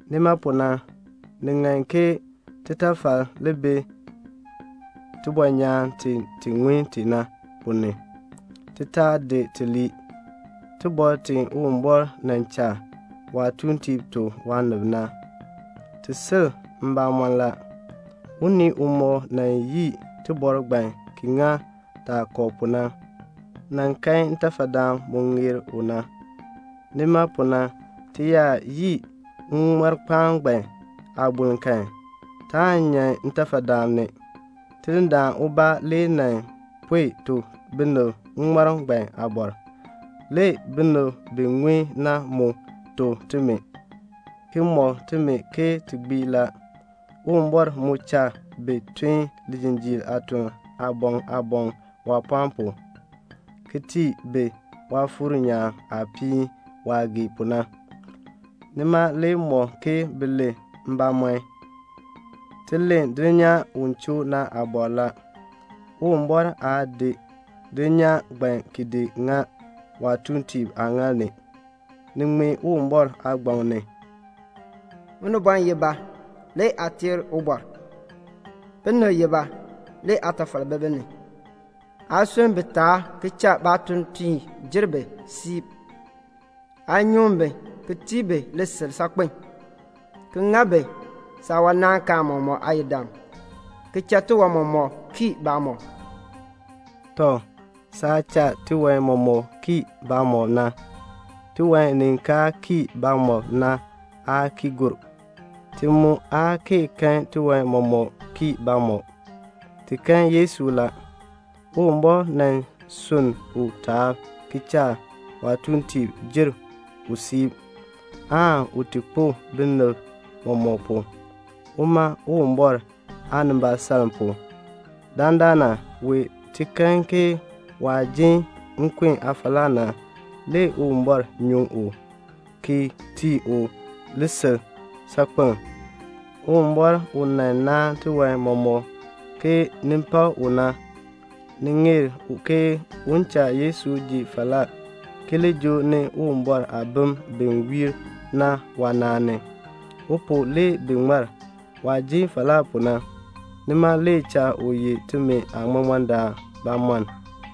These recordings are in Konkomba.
Nima pu na, ni ŋan ke titafal li bi tibɔnyaan ti ti ŋun ti na ponn ni, ti taa di ti lii. Iliin i Uwumbɔr nan cha waatuuntiib tuk waanib na, i sil mbamɔm la. Unii umɔk yii iliin ngbaan ki ŋa yaah kɔ pu na, u kan ntafadaan waah ŋeer pu na. Nima pu na ti yaa yii ŋŋmarkpaan ngbaan aaboln kan, taan nyan ntafadaan ni. Tidindaan ubaa le nan pue tuk binib ŋŋmarm ngbaan aabɔr. Le binib bi ŋun na tuk timi, ki mɔk timi ke ti gbii la. Uwumbɔr mu cha bi tun lijinjiir aatun aaboŋ aaboŋ waapɔɔn pu, ki tii bi Waafuur nyaan aapiin waah gee pu na. Nima le mɔk ke bi len mbamɔn. Ti len dulnyaa u choo na aabɔr la. Uwumbɔr aa di dulnyaa ngbaan ki di ŋa waatuuntiib aaŋaal ni. Ni ŋmee Uwumbɔr aagbaŋ ni: "Unibɔn ye ba? le aa teer u; binib ye ba? le aatafal bi bi ni. Aa sunn bi taab ki cha saatuuntiib jer bi siib. Aa nyuŋ bi ki tii bi lisil saakpen, ki ŋa bi saawanaankaan mɔmɔk aayidam, ki cha tiwan mɔmɔk kii baamɔb." Tɔ, saah cha tiwan mɔmɔk kii baamɔb na, tiwan ni kaa kii baamɔb na aa ki gur. Ti mu aa kee kan tiwan mɔmɔk kii baamɔb; ti kan Yesu la. Uwumbɔr sunn u taab ki cha waatuuntiib jer u siib, aan u ti kpo ki tii binib mɔmɔk, uma Uwumbɔr aanimbaasaln pu. Dandana wee ti kan ke waah jin nkun aafalaa na, le Uwumbɔr nyuŋ u ki tii u lisil saakpen. Uwumbɔr u nan naan tiwan mɔmɔk ke ni pak u na, ni ŋeer u ke un cha Yesu ji falaa, ki li joo ni Uwumbɔr aabim bi wiir na waanaan ni. U pu le bi ŋmar. Waah ji falaa pu na, nima le cha u ye timi aaŋmaŋmardaan bamɔnn.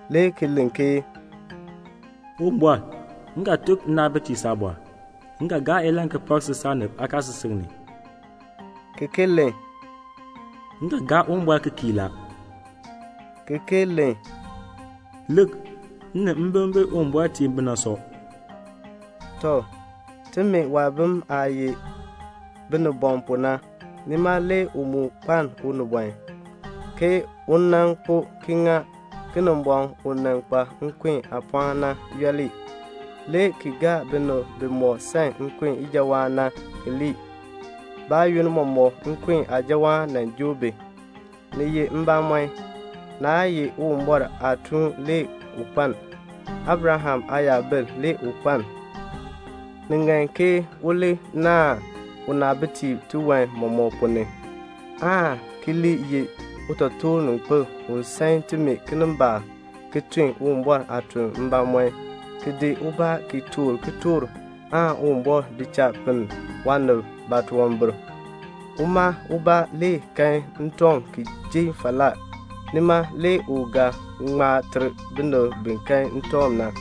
le ki len ke "Uwumbɔr, m ga tuk nnaabitiib saabɔr. M ga gaa ilahn ki pak si saanib aakaasisik ni," ki ki len: "M ga gaa Uwumbɔr ki kii la," ki ki len: "Lik, m ni mbim bi Uwumbɔr tii mi bi na sɔ." Tɔ, timi waabim aah ye binibɔm pu na, nima le u mu kpaln unibɔn, ke un ti kpo, ki ŋa Kinimbɔŋ u nan kpa nkun aapɔɔn na yooli, le ki gaa binib bimɔk san nkun ijawaan na ki lii; baayoonn mɔmɔk nkun aajawaan nan joo bi. Ni ye mbamɔn, naa ye Uwumbɔr aatuun le u kpaln. Abraham aayabil le u kpaln. Ni ŋan ke u naahn unaabitiib tiwan mɔmɔk ponn ni, aan ki li ye utotoorninkpil u san timi kinimbaak, ki tun Uwumbɔr aatuln mbamɔm, ki di ubaa ki toor kitork aan Uwumbɔr di cha pinn waanib baatunwambir. Uma ubaa le kan ntɔŋ ki ji falaa, nima le u ga ŋma ter binib bi kan ntɔŋ na.